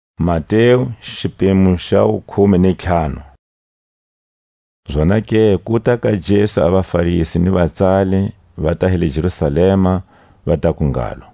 A xilo lexi xi nyenyezisako. Zonake kuta ka Jesu a vaFarisi ni vatsali vata hi le Jerusalema, va taku ngalo: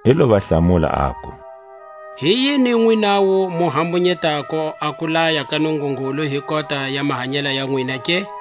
I lo va hlamula, aku: Hi yini nwinawu mu hambunyetako a kulaya ka Nungungulu hi kota ya mahanyela ya nwina ke?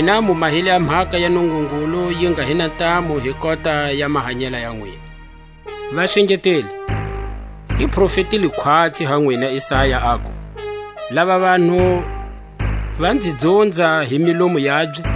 Nwina mu mahile a mhaka ya Nungungulu yi nga hi na ntamu hi kota ya mahanyela ya nwina. Vaxengeteli, i profetile khwatsi ha nwina Isaya, aku: Lava vanhu va nzi dzunza hi milomu yabye,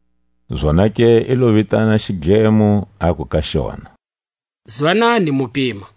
Zonake i lo vitana xidlemo, aku ka xona: Zwanani, mu pima!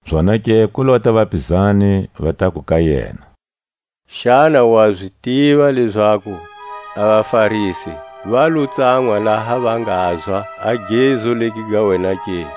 Zonake ku lota vapizani, va taku ka yena: Xana wa zi tiva lezaku a vaFarisi va lo tsanwa laha va ngazwa a gezu legi ga wena ke?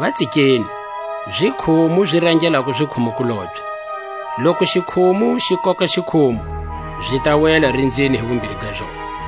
Va tsikeni; zikhumu, zi rangelako zikhumu-kulobye. Loku xikhumu xi koka xikhumu, zi ta wela rinzini hi wumbiri ga zona.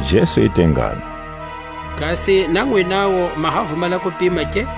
Jesu i te ngalo: Kasi na nwinawu ma ha vumala kupima ke?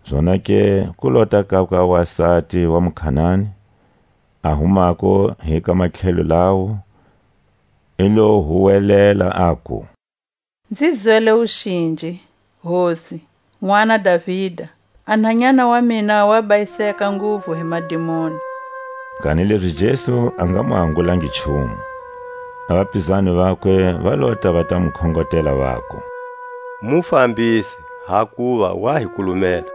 Zonake ku lota kakwe a wasati wa muKanani, a humako hi ka matlhelo lawo; i lo huwelela, aku: Nzi zwele wuxinji, Hosi, nʼwana, Davida; a nhanyana wa mina wa bayiseka nguvu hi madimoni. Kanilezi Jesu a nga mu angulangi nchumu. A vapizani vakwe va lota va ta mu khongotela, vaku: Mu fambise; hakuva wa hi kulumela.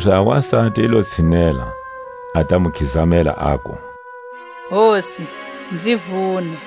Kanilezi a wasati i lo tshinela, a ta mu khizamela, aku: Hosi, nzi vune.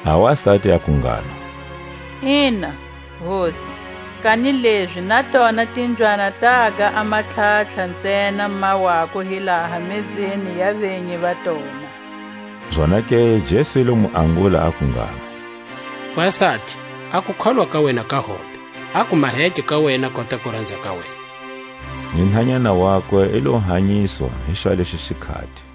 A wasati aku ngalo: Ina, Hosi; kanilezi na tona timbyana taga a matlhatlha ntsena ma wako hi laha mezeni ya venyi va tona. Zonake Jesu i lo mu angula aku ngalo: Wasati, a kukholwa ka wena ka hombe; a ku maheke ka wena kota kuranza ka wena. Ni nhanyana wakwe i lo hanyiswa hi xwalexo xikhati. A vanyingi va hanyiswa.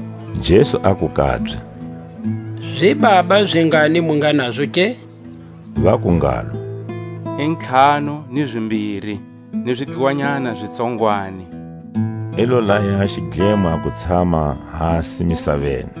Jesu aku kabye: Zibaba zingani mu nga nazo ke? Vaku ngalo: I ntlhanu ni zimbiri, ni zidluwanyana zi tsongwani. I lo laya a xidlemo a ku tshama hasi misaveni.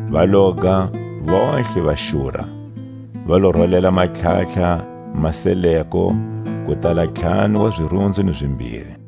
Va loga vontlhe va xura; va lo rolela a matlhatlha ma seleko, ku tala ntlhanu wa zirunzu ni zimbiri.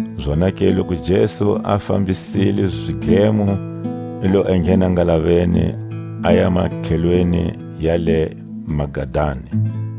Zonake loku Jesu a fambisile zidlemo, i lo enghena ngalaveni, aya matlhelweni ya le Magadani.